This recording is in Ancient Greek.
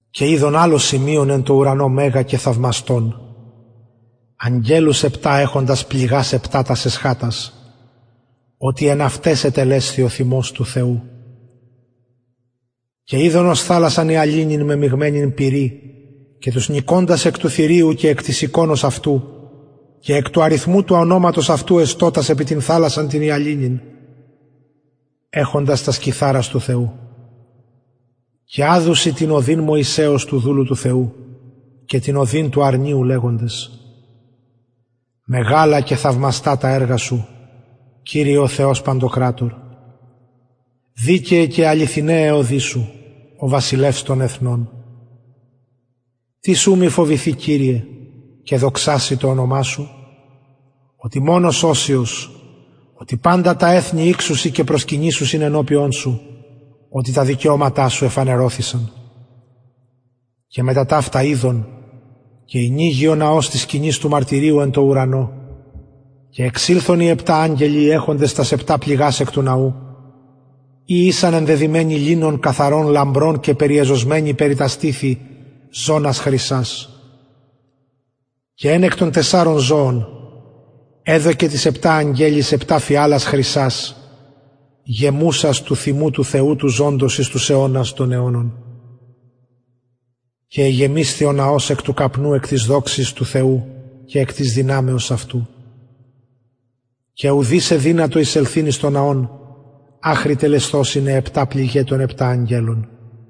και ειδον αλλο σημειον εν τω ουρανω μεγα και θαυμαστον αγγελους επτα εχοντας πληγας επτα τας εσχατας οτι εν αυταις ετελεσθη ο θυμος του θεου και ειδον ως θαλασσαν υαλινην μεμιγμενην πυρι και τους νικωντας εκ του θηριου και εκ της εικονος αυτου και εκ του αριθμου του ονοματος αυτου εστωτας επι την θαλασσαν την υαλινην εχοντας κιθαρας του θεου και αδουσιν την ωδην μωυσεως του δουλου του θεου και την ωδην του αρνιου λεγοντες μεγαλα και θαυμαστα τα εργα σου κυριε ο θεος ο παντοκρατωρ δικαιαι και αληθιναι αι οδοι σου ο βασιλευς των εθνων τις ου μη φοβηθη σε κυριε και δοξαση το ονομα σου οτι μονος αγιος οτι παντα τα εθνη ηξουσιν και προσκυνησουσιν ενωπιον σου οτι τα δικαιωματα σου εφανερωθησαν και μετα ταυτα ειδον και ηνοιγη ο ναος της σκηνης του μαρτυριου εν τω ουρανω και εξηλθον οι επτα αγγελοι οι εχοντες τας επτα πληγας εκ του ναου οι ησαν ενδεδυμενοι λινον καθαρον λαμπρον και περιεζωσμενοι περι τα στηθη ζωνας χρυσας και εν εκ των τεσσαρων ζωων εδωκεν τοις επτα αγγελοις επτα φιαλας χρυσας γεμουσας του θυμου του θεου του ζωντος εις τους αιωνας των αιωνων και εγεμισθη ο ναος καπνου εκ της δοξης του θεου και εκ της δυναμεως αυτου και ουδεις εδυνατο εισελθειν εις τον ναον αχρι τελεσθωσιν αι επτα πληγαι των επτα αγγελων